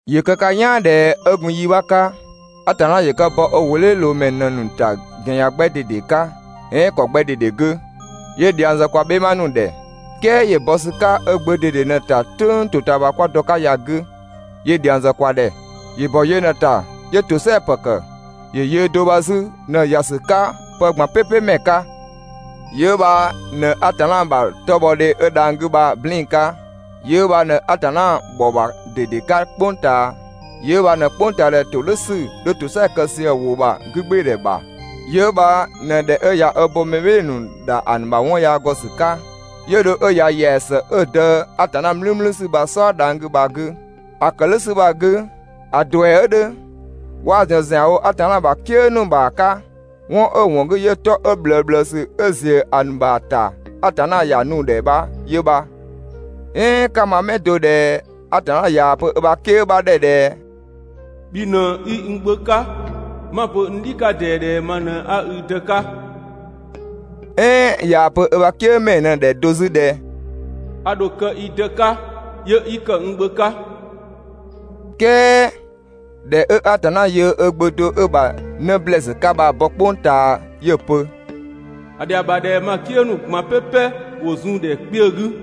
‑Yö kë ka "yaan ꞊dhɛ 'ö gun yi 'bha 'ka, Atanna ‑yö kë ‑bɔ ö ‑wʋdhiʋ̈loomɛ ‑nu ꞊në‑ ‑nu ‑ta ‑gɛn ‑yan 'gbɛ ꞊dede 'ka "ɛɛn ‑kɔ 'gbɛ ꞊dede 'gü, 'yö dhiang zë kwa "bhɛma ‑nu ‑dhɛ. "Kɛɛ ‑yö bɔ ‑sü 'ka ö Gbö ꞊dede ꞊në‑ ‑ta "tʋ̈ng ‑totaamasü 'kwa dɔ‑ 'ka ya‑ 'gü, 'yö dhiang zë kwa ‑dhɛ. ‑Yö ‑bɔ yö ꞊në‑ ‑ta 'yö ‑tosɛa ‑pë ‑kë, ‑yö yöö do bha 'zü ꞊në‑ ‑ya ‑sü 'ka pë ꞊gban "pɛpɛ ‑mɛ 'ka. Yö 'ö bha ꞊në Atanna ‑bha 'tɔbhɔdhe 'ö dhang‑ 'gü bha‑ "blɛɛn‑ 'ka. Yö 'ö bha ꞊në Atanna ‑bhɔ bha ꞊dede 'ka "kpʋng ꞊taa. Yö 'ö bha ꞊në "kpʋngtaadhɛ ‑todhʋ̈sü 'dhö ‑tosɛa kë sië‑ ‑wʋ ‑bha 'gügbɩɩdhɛ ‑bha. Yö 'ö bha ꞊në ꞊dhɛ 'ö ꞊ya 'ö bo mɛ "bhɩɩ‑ ‑nu ‑dha ‑a ‑nu ‑bha 'wɔn yaa ‑gɔ ‑sü 'ka, 'yö dho 'ö ‑ya ‑yɛa ‑së 'ö‑ Dë Atanna "mlümlüsü bha‑ "sɔɔ dhang‑ 'gü bha‑ 'gü. ‑A ‑kë "dhʋ̈ ‑sü bha‑ 'gü ‑a ‑duɛ 'ö 'dhö, 'waa‑ ‑zɔn ‑zianwo Atanna ‑bha "kië ‑nu ‑bha 'ka, 'wɔn 'ö‑ ‑wɔn 'gü 'yö 'tɔ 'ö ꞊bhlëësü 'ö ‑ziö ‑a ‑nu ‑bha ‑ta Atanna ‑ya nu‑ ‑dhɛ bha 'yö bha. "Ɛɛn 'ka‑ ma 'mɛ do ꞊dhɛ Atanna ꞊yaa‑ pö ö ‑bha "kië 'bha ‑dhɛ ꞊dhɛ: «Bhi ꞊në 'i n Gbö 'ka, 'ma‑ pö n "dhi 'ka ꞊dɛɛ ꞊dhɛ ma ꞊në 'a i Dë 'ka?» "ɛɛn ꞊yaa‑ pö ö ‑bha "kië ‑mɛɛ ꞊në‑ ‑dhɛ do 'zü ꞊dhɛ: «A ‑dho kë i Dë 'ka, 'yö 'i ‑kë n Gbö 'ka.» "Kɛɛ ꞊dhɛ 'ö Atanna yöö ö Gbö do 'ö‑ ‑bha 'në ‑blɛɛsü 'ka bha‑ bɔ "kpʋng ꞊taa 'yö‑ pö: «‑A ‑dhɛa ‑bha ꞊dhɛ ma "kië ‑nu ꞊gban "pɛpɛ ‑wo zun‑ ‑dhɛ kpiö 'gü.»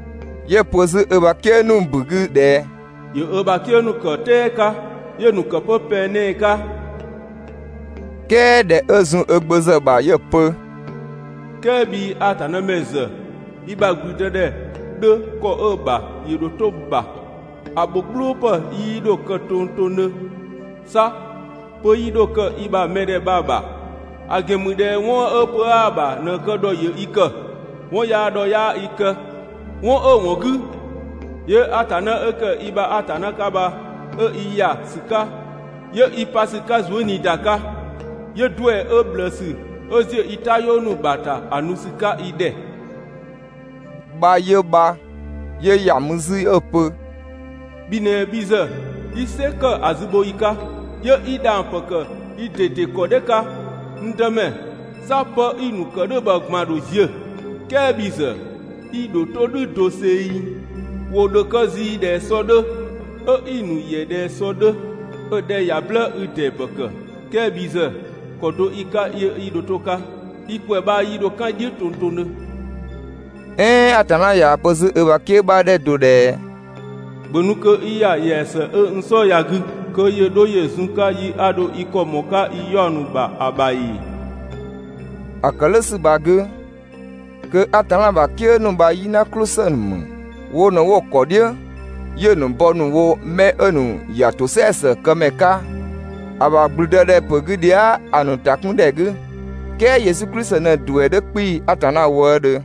'Yö‑ pö 'zü ö ‑bha "kië ‑nu ‑bu 'gü ꞊dhɛ: «‑Yö ö ‑bha "kië ‑nu ‑kë "tɛɛ 'ka, 'yö‑ ‑nu ‑kë 'pö pɛng 'nɛɛ‑ 'ka.» "Kɛɛ ꞊dhɛ 'ö zun ö Gbö ‑zë ‑bha 'yö‑ pö: «"Kɛɛ bhii Atanna ‑mɛ ‑zë i ‑bha ‑gblüdëdhɛ 'dhö ‑kɔ 'ö‑ ‑bha 'yö dho 'to‑ ‑bha, ‑a ‑bho "gblʋʋ ‑pë 'yii 'dho kë tongtongdhö, 'sa pö 'yii 'dho kë i ‑bha mɛdhɛ bha‑ ‑bha, ‑a ‑gɛn ‑mü ꞊dhɛ 'wɔn 'ö pö 'aa‑ ‑bha ꞊në‑ kë ‑dhɔ ‑yö i ‑kë, 'wɔn yaa ‑dhɔ 'yaa i kë, 'wɔn 'ö‑ ‑wɔn 'gü, 'yö Atanna 'ö ‑kë i ‑bha Atanna 'ka bha 'ö i ‑ya ‑sü 'ka, 'yö i pa ‑sü 'ka zuëniida 'ka, 'yö ‑duɛ 'ö ꞊bhlëësü 'ö ‑ziö i "tayɔɔ ‑nu ‑bha ‑ta ‑a nu ‑sü 'ka i ‑dhɛ.» bha 'yö bha. 'Yö ‑ya mü 'zü 'ö‑ pö: «Bhi ꞊në bhi ‑zë 'i "sɛ ‑kë ‑a zübhoyi 'ka, 'yö 'i dhang‑ ‑pë ‑kë i ꞊dede ‑kɔ "dhɛ 'ka, n Dëmɛ. 'Sa 'pë 'i‑ ‑nu ‑kë "dhʋ̈ bha ꞊gban‑ ‑dho ziö, "kɛɛ bhi ‑zë, i ‑dho 'to "dhʋ̈ doseng. ‑Wo ‑dho kë zii ꞊dhɛ sɔ 'dhö, 'ö 'i‑ ‑nu ‑yɛ ꞊dhɛ sɔ 'dhö, 'ö‑ 'dhɛ ꞊ya "blë 'i‑ ‑dee ‑pë ‑kë, "kɛɛ bhi ‑zë, ‑kɔ do 'i‑ 'ka 'yö 'i dho 'to‑ 'ka, i ‑kwɛ 'bha 'yii 'dho "kan "dhiʋ̈ tongtongdhö.» "Ɛɛn Atanna ꞊yaa‑ pö 'zü ö ‑bha "kië 'bha ‑dhɛ do ꞊dhɛ: «‑Bhö nu kö 'i ‑ya ‑yɛa ‑së 'ö n "sɔɔ ya‑ 'gü kö ‑yö 'dho ‑yö zun‑ 'ka yi 'a ‑dho i ‑kɔ ꞊mɔɔ‑ 'ka i 'yaɔ‑ ‑nu ‑bha ‑a ‑bha ‑ee?» ‑A ‑kë "dhʋ̈ ‑sü bha‑ 'gü, kö Atanna ‑bha "kië ‑nu bha "yina "klʋ ‑së ‑nu ‑mü. Wo ꞊në 'wo‑ ‑kɔ "dhiʋ̈ 'yö‑ ‑nu bɔ ‑nu wo 'mɛ 'ö‑ ‑nu ‑ya ‑tosɛa ‑së këmɛ 'ka ‑a ‑bha ‑gblüdëdhɛpö 'gü dhia" ‑a ‑nu ‑ta 'kun ‑dhɛ 'gü. ("Kɛɛ Yesu Klisi ꞊në‑ ‑duɛ 'dhö 'kpii‑ Atanna wëëdhö.)